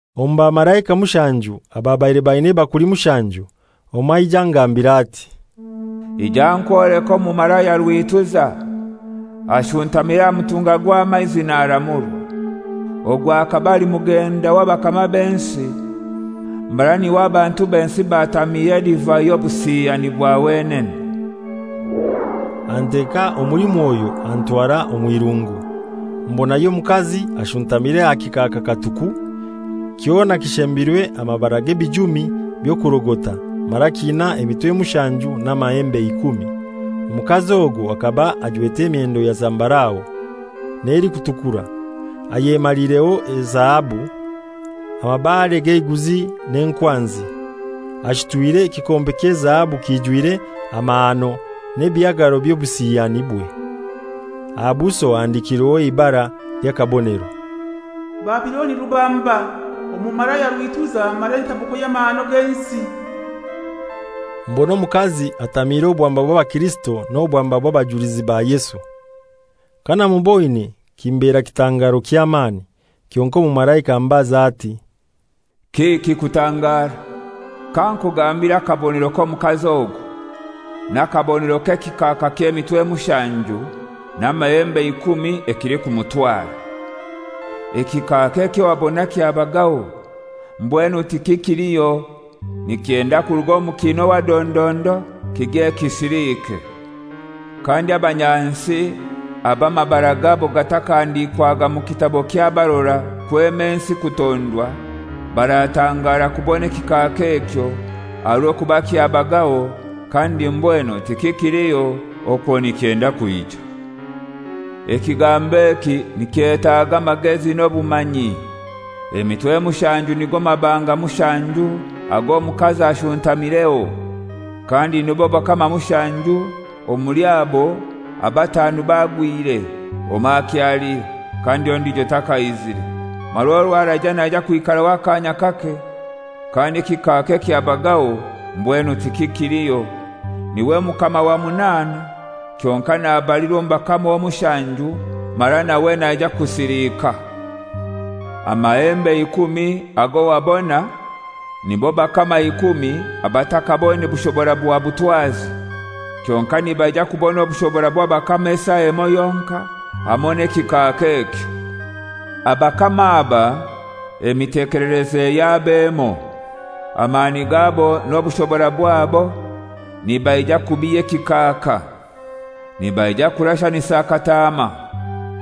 Omu bamalaika mushanju ababaire baina ebakuli mushanju, omoi aija angambira ati, «Ija nkwoleke omumalaya rwituza ashuntamire aha mutunga gw'amaizi naramurwa. Ogu akaba ali mugenda w'abakama b'ensi, mara n'iwe abantu b'ensi batamiire edivai y'obusiyani bwa wenene.» Anteka omuli Mwoyo antwara omw'irungu, mbonayo omukazi ashuntamire aha kikaaka katuku, kyona kishembirwe amabara g'ebijumi by'okurogota, mara kiina emitwe mushanju n'amahembe ikumi. Omukazi ogwo akaba ajwete emyendo ya zambarau, n'elikutukura, ayemaliireho ezahabu, amabare g'eiguzi n'enkwanzi, ashutwire ekikompe ky'ezahabu kijwire amahano n'ebihagaro by'obusiyanibwe. Aha buso ahandikirweho eibara ly'akabonero: «Babiloni rubamba, omumalaya rwituza mara entabuko y'amahano g'ensi.» Mbona omukazi atamiire obwamba bw'abakirisito n'obwamba bw'abajulizi ba Yesu. Kanamuboine kimbera kitangaro ky'amani. Kyonkai omumalaika ambaza ati, «Kiki kutangara? Kankugambire akabonero k'omukazi ogu, n'akabonero k'ekikaaka ky'emitwe mushanju n'amahembe ikumi ekilikumutwara. Ekikaaka ekyo wabona kyabagaho, mbwenu tikikiliho, nikyenda kuruga omu kiina owa dondondo kigye kisilike. Kandi abanyansi abo amabara gabo gatakahandikwaga mu kitabo ky'abarora kwema ensi kutondwa, baratangara kubona ekikaaka ekyo, aha rw'okuba kyabagaho, kandi mbwenu tikikiliho, okwo nikyenda kwija. Ekigambo eki nikyetaaga amagezi n'obumanyi: Emitwe mushanju nigo mabanga mushanju ag'omukazi ashuntamireho; kandi nibo bakama mushanju, omuli abo abatanu bagwire, omoi akyaliho, kandi ondijo takaizire, mara orw'araija naija kwikaraho akaanya kake. Kandi ekikaaka ekyabagaho mbwenu tikikiliho, n'iwe mukama wa munaana kyonkai nabalirwa omu bakama omushanju, mara nawe naija kusilika. Amahembe ikumi ago wabona nibo bakama ikumi abatakaboine bushobora bwa butwazi, kyonkai nibaija kubona obushobora bw'abakama esaa emoi yonkai, hamoi n'ekikaaka ekyo. Abakama aba emitekelereze yabo emoi. Amani gabo n'obushobora bwabo nibaija kubiha ekikaaka. Nibaija kurashanisa Kataama,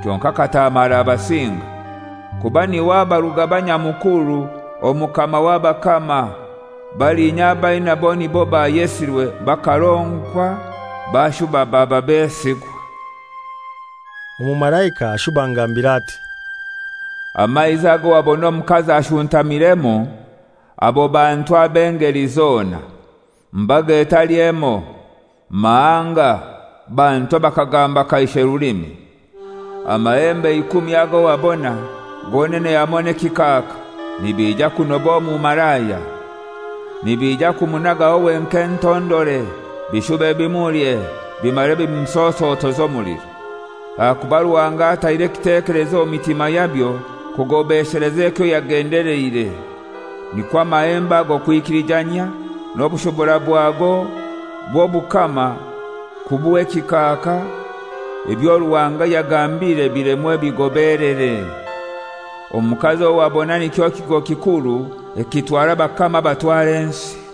kyonkai Kataama arabasinga, kuba n'iwe aba Rugaba Nyamukuru, Omukama w'abakama; baliinya ab'ainaibo nibo bayesirwe, bakaronkwa bashuba baba besigwa.» Omumalaika ashuba angambira ati, «Amaizi ago wabona omukazi ashuntamiremu, abo bantu ab'engeli zona, mbaga etali emoi, mahanga, bantu abakagamba kaishe rulimi. Amahembe ikumi ago wabona, gonene hamoi n'ekikaaka nibija kunoba omumalaya. Nibija kumunagaho wenkai entondore, bishube bimulye, bimare bimusosotoze omuliro. Ahakuba Ruhanga ataire ekitekelezo omu mitima yabyo kugobesheleza ekyo yagendeleire: Nikwo amahembe ago kwikilijanyia, n'obushobora bwago bw'obukama kubuha ekikaaka, ebyo Ruhanga yagambire bilemwe bigobelere. Omukazi owo wabona nikyo kigo kikuru ekitwara abakama abatwara ensi.»